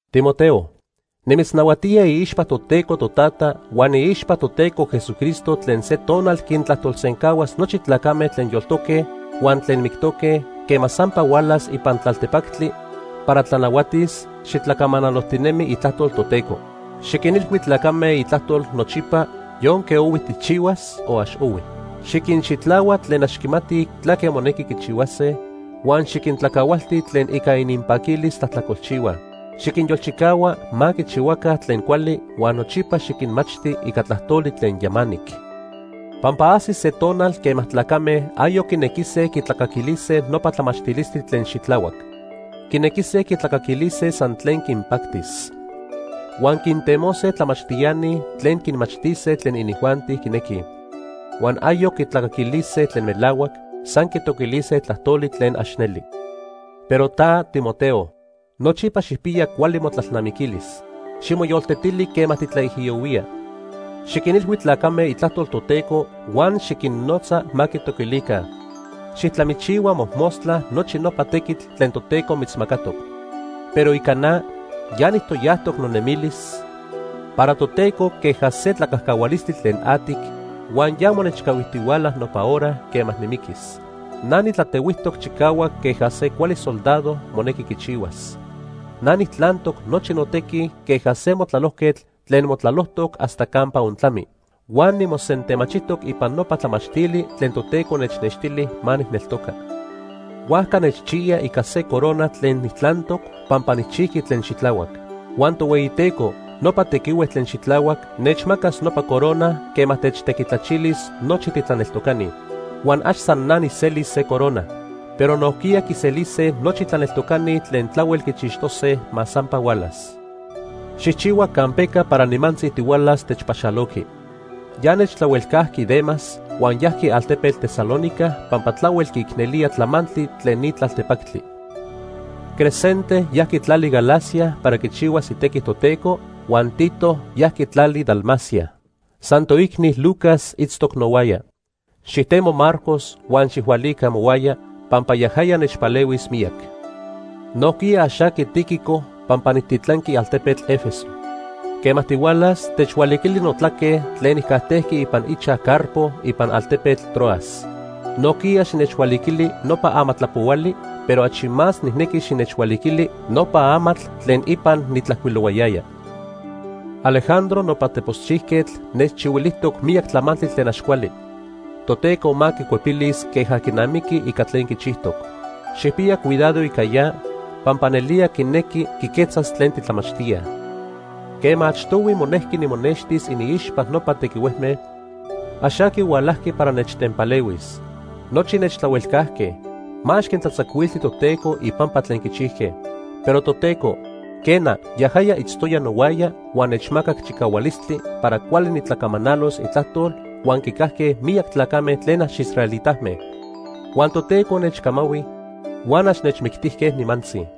Timoteo, nimitznahuatía iixpa Toteco Totata huan iixpa Toteco Jesucristo tlen se tonal quintlajtolsencahuas nochi tlacame tlen yoltoque huan tlen mictoque quema sampa hualas ipan tlaltepactli para tlanahuatis, xitlacamanalojtinemi itlajtol Toteco. Xiquinilhui tlacame itlajtol nochipa yonque ohui tijchihuas o ax ohui. Xiquinxitlahua tlen ax quimatij tlaque monequi quichihuase huan xiquintlacahualti tlen ica ininpaquilis tlajtlacolchihuaj. Xiquinyolchicahua ma quichihuaca tlen cuali huan nochipa xiquinmachti ica tlajtoli tlen yamanic. Pampa ajsis se tonal quema tlacame ayoc quinequise quitlacaquilise nopa tlamachtilistli tlen xitlahuac. Quinequise quitlacaquilise san tlen quinpactis. Huan quintemose tlamachtiani tlen quinmachtise tlen inijuanti quinequij. Huan ayoc quitlacaquilise tlen melahuac, san quitoquilise tlajtoli tlen ax neli. Pero ta, Timoteo, nochipa xijpiya cuali motlalnamiquilis. Ximoyoltetili quema titlaijiyohuía. Xiquinilhui tlacame itlajtol Toteco huan xiquinnotza ma quitoquilica. Xijtlamichihua mojmostla nochi nopa tequitl tlen Toteco mitzmacatoc. Pero ica na, ya nijtoyajtoc nonemilis para Toteco queja se tlacajcahualistli tlen atic, huan ya monechcahuijtihuala nopa hora quema nimiquis. Na nitlatehuijtoc chicahuac queja se cuali soldado monequi quichihuas. Na nitlantoc nochi notequi queja se motlalojquetl tlen motlalojtoc hasta campa ontlami. Huan nimosentemachijtoc ipan nopa tlamachtili tlen Toteco nechnextili ma nijneltoca. Huajca nechchiya ica se corona tlen nijtlantoc pampa nijchijqui tlen xitlahuac. Huan Tohueyiteco, nopa tequihue tlen xitlahuac, nechmacas nopa corona quema techtequitlachilis nochi titlaneltocani. Huan ax san na nijselis se corona, pero nojquiya quiselise nochi tlaneltocani tlen tlahuel quichixtose ma sampa hualas. Xijchihua campeca para nimantzi tihualas techpaxaloqui. Ya nechtlahuelcajqui Demas huan yajqui altepetl Tesalónica pampa tlahuel quiicnelía tlamantli tlen ni tlaltepactli. Crescente yajqui tlali Galacia para quichihuas itequi Toteco, huan Tito yajqui tlali Dalmacia. San toicni Lucas itztoc nohuaya. Xijtemo Marcos huan xijhualica mohuaya pampa yajaya nechpalehuis miyac. Nojquiya ax aqui Tíquico pampa nijtitlanqui altepetl Éfeso. Quema tihualas, techhualiquili notlaque tlen nijcajtejqui ipan ichaj Carpo ipan altepetl Troas. Nojquiya xinechhualiquili nopa amatlapohuali, pero achi más nijnequi xinechhualiquili nopa amatl tlen ipan nitlajcuilohuayaya. Alejandro nopa teposchijquetl nechchihuilijtoc miyac tlamantli tlen ax cuali. Toteco ma quicuepilis queja quinamiqui ica tlen quichijtoc. Xijpiya cuidado ica ya pampa nelía quinequi quiquetzas tlen titlamachtíaj. Quema achtohui monejqui nimonextis iniixpa nopa tequihuejme, ax aqui hualajqui para nechtenpalehuis. Nochi nechtlahuelcajque. Ma ax quintlatzacuilti Toteco ipampa tlen quichijque. Pero Toteco, quena, yajaya itztoya nohuaya huan nechmacac chicahualistli para cuali nitlacamanalos itlajtol huan quicajque miyac tlacame tlen ax israelitame. Huan Toteco nechmanahui huan ax nechmictijque nimantzi.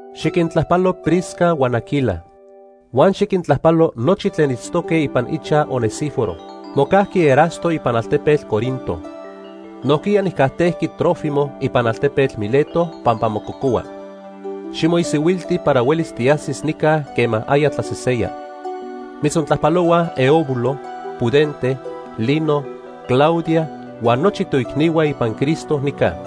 Xiquintlajpalo Prisca huan Aquila. Huan xiquintlajpalo nochi tlen itztoque ipan ichaj Onesíforo. Mocajqui Erasto ipan altepetl Corinto. Nojquiya nijcajtejqui Trófimo ipan altepetl Mileto pampa mococohua. Ximoisihuilti para huelis tiajsiqui nica quema aya tlaseseya. Mitzontlajpalohuaj Eubulo, Pudente, Lino, Claudia huan nochi toicnihua ipan Cristo nica.